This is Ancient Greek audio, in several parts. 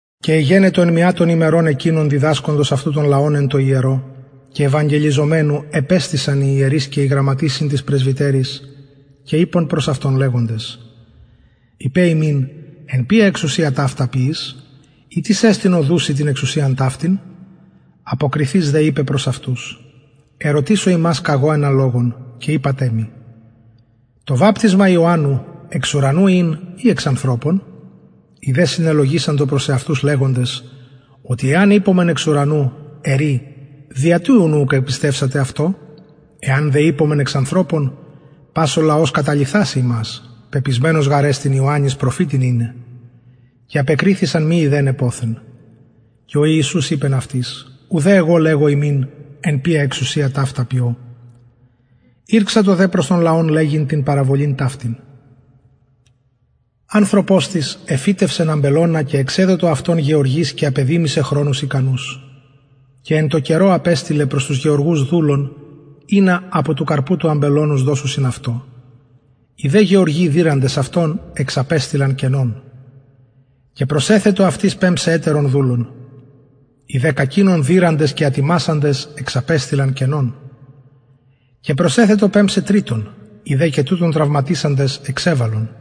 και εγενετο εν μια των ημερων εκεινων διδασκοντος αυτου τον λαον εν τω ιερω και ευαγγελιζομενου επεστησαν οι ιερεις και οι γραμματεις συν τοις πρεσβυτεροις και ειπον προς αυτον λεγοντες ειπε ημιν εν ποια εξουσια ταυτα ποιεις η τις εστιν ο δους σοι την εξουσιαν ταυτην αποκριθεις δε ειπεν προς αυτους ερωτησω υμας καγω ενα λογον και ειπατε μοι το βαπτισμα ιωαννου εξ ουρανου ην η εξ ανθρωπων οι δε συνελογισαντο προς εαυτους λεγοντες οτι εαν ειπωμεν εξ ουρανου ερει δια τι ουκ επιστευσατε αυτω εαν δε ειπωμεν εξ ανθρωπων πας ο λαος καταλιθασει ημας πεπεισμενος γαρ εστιν ιωαννην προφητην ειναι και απεκριθησαν μη ειδεναι ποθεν και ο ιησους ειπεν αυτοις ουδε εγω λεγω υμιν εν ποια εξουσια ταυτα ποιω ηρξατο δε προς τον λαον λεγειν την παραβολην ταυτην ανθρωπος εφυτευσεν αμπελωνα και εξεδοτο αυτον γεωργοις και απεδημησεν χρονους ικανους και εν καιρω απεστειλεν προς τους γεωργους δουλον ινα απο του καρπου του αμπελωνος δωσιν αυτω οι δε γεωργοι δειραντες αυτον εξαπεστειλαν κενον και προσεθετο πεμψαι ετερον δουλον οι δε κακεινον δειραντες και ατιμασαντες εξαπεστειλαν κενον και προσεθετο πεμψαι τριτον οι δε και τουτον τραυματισαντες εξεβαλον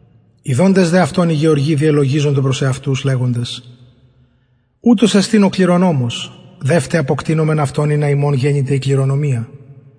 ιδοντες δε αυτον οι γεωργοι διελογιζοντο προς εαυτους λεγοντες ουτος εστιν ο κληρονομος δευτε αποκτεινωμεν αυτον ινα ημων γενηται η κληρονομια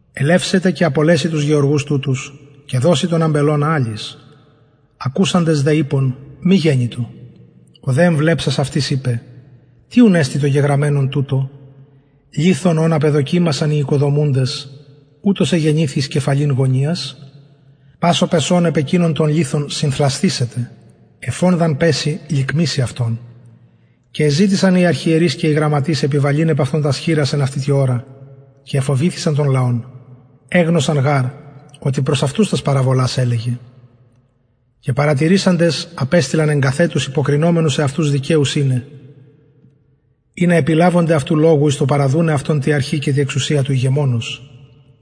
ελευσεται και απολεσει τους γεωργους τουτους και δωσει τον αμπελωνα αλλοις ακουσαντες δε ειπον μη γενοιτο ο δε εμβλεψας αυτοις ειπεν τι ουν εστιν το γεγραμμενον τουτο λιθον ον απεδοκιμασαν οι οικοδομουντες ουτος εγενηθη εις κεφαλην γωνιας πας ο πεσων επ εκεινον τον λιθον συνθλασθησεται εφ ον δ αν πεση λικμησει αυτον και εζητησαν οι αρχιερεις και οι γραμματεις επιβαλειν επ αυτον τας χειρας εν αυτη τη ωρα και εφοβηθησαν εγνωσαν γαρ οτι προς αυτους την παραβολην ταυτην ειπεν και παρατηρησαντες απεστειλαν εγκαθετους υποκρινομενους εαυτους δικαιους ειναι ινα επιλαβωνται αυτου λογου εις το παραδουναι αυτον τη αρχη και τη εξουσια του ηγεμονος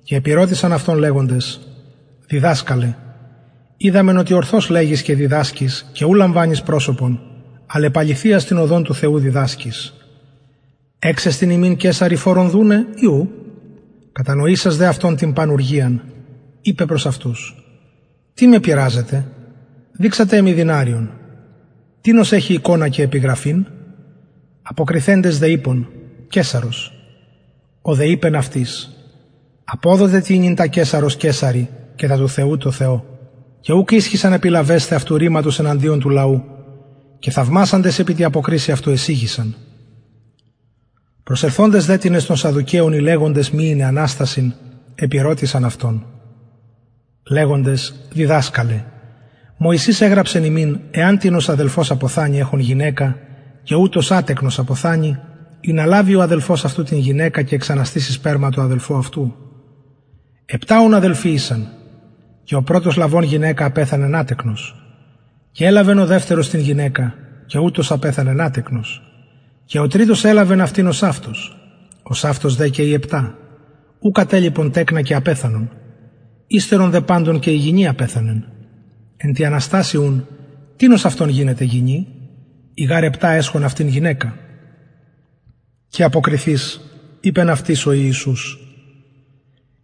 και επηρωτησαν αυτον λεγοντες διδασκαλε οιδαμεν οτι ορθως λεγεις και διδασκεις και ου λαμβανεις προσωπον αλλ επ αληθειας την οδον του θεου διδασκεις εξεστιν ημιν καισαρι φορον δουναι η ου κατανοησας δε αυτων την πανουργιαν ειπεν προς αυτους τι με πειραζετε επιδειξατε μοι δηναριον τινος εχει εικονα και επιγραφην αποκριθεντες δε ειπον καισαρος ο δε ειπεν αυτοις αποδοτε τοινυν τα καισαρος καισαρι και τα του θεου τω θεω και ουκ ισχυσαν επιλαβεσθαι αυτου ρηματος εναντιον του λαου και θαυμασαντες επι τη αποκρισει αυτου εσιγησαν προσελθοντες δε τινες των σαδδουκαιων οι αντιλεγοντες αναστασιν μη ειναι επηρωτησαν αυτον λεγοντες διδασκαλε μωσης εγραψεν ημιν εαν τινος αδελφος αποθανη εχων γυναικα και ουτος ατεκνος αποθανη ινα λαβη ο αδελφος αυτου την γυναικα και εξαναστηση σπερμα τω αδελφω αυτου επτα ουν αδελφοι ησαν και ο πρωτος λαβων γυναικα απεθανεν ατεκνος και ελαβεν ο δευτερος την γυναικα και ουτος απεθανεν ατεκνος και ο τριτος ελαβεν αυτην ωσαυτως ωσαυτως δε και οι επτα ου κατελιπον τεκνα και απεθανον υστερον δε παντων απεθανεν και η γυνη εν τη ουν αναστασει τινος αυτων γινεται γυνη οι γαρ επτα εσχον αυτην γυναικα και αποκριθεις ειπεν αυτοις ο ιησους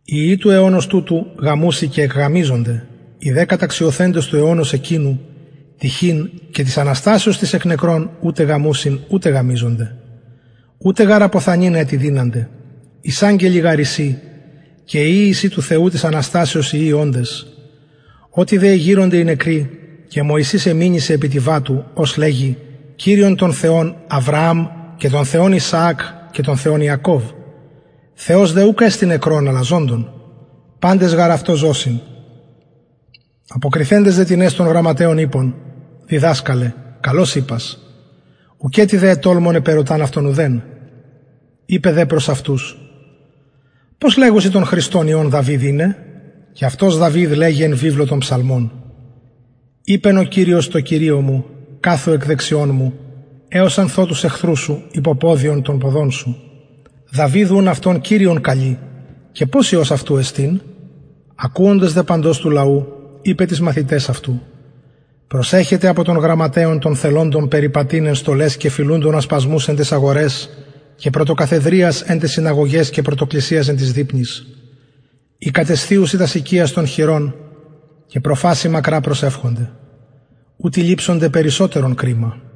οι υιοι του αιωνος τουτου γαμουσιν και εκγαμισκονται οι δε καταξιωθεντες του αιωνος εκεινου τυχειν και της αναστασεως της εκ νεκρων ουτε γαμουσιν ουτε εκγαμιζονται ουτε γαρ αποθανειν ετι δυνανται ισαγγελοι γαρ εισιν και υιοι εισιν του θεου της αναστασεως υιοι οντες οτι δε εγειρονται οι νεκροι και μωσης εμηνυσεν επι της βατου ως λεγει κυριον τον θεον αβρααμ και τον θεον ισαακ και τον θεον ιακωβ θεος δε ουκ εστιν νεκρων αλλα ζωντων παντες γαρ αυτω ζωσιν αποκριθεντες δε τινες των γραμματεων ειπον διδασκαλε καλως ειπας ουκετι δε ετολμων επερωταν αυτον ουδεν ειπεν δε προς αυτους πως λεγουσιν τον χριστον υιον δαυιδ ειναι και αυτος δαυιδ λεγει εν βιβλω ψαλμων ειπεν ο κυριος τω κυριω μου καθου εκ δεξιων μου εως αν θω τους εχθρους σου υποποδιον των ποδων σου δαυιδ ουν κυριον αυτον καλει και πως υιος αυτου εστιν ακουοντος δε παντος του λαου ειπεν τοις μαθηταις αυτου προσεχετε απο των γραμματεων των θελοντων περιπατειν εν στολαις και φιλουντων ασπασμους εν ταις αγοραις και πρωτοκαθεδριας εν ταις συναγωγαις και πρωτοκλισιας εν τοις δειπνοις οι κατεσθιουσιν τας οικιας των χηρων και προφασει μακρα προσευχονται ουτοι ληψονται περισσοτερον κριμα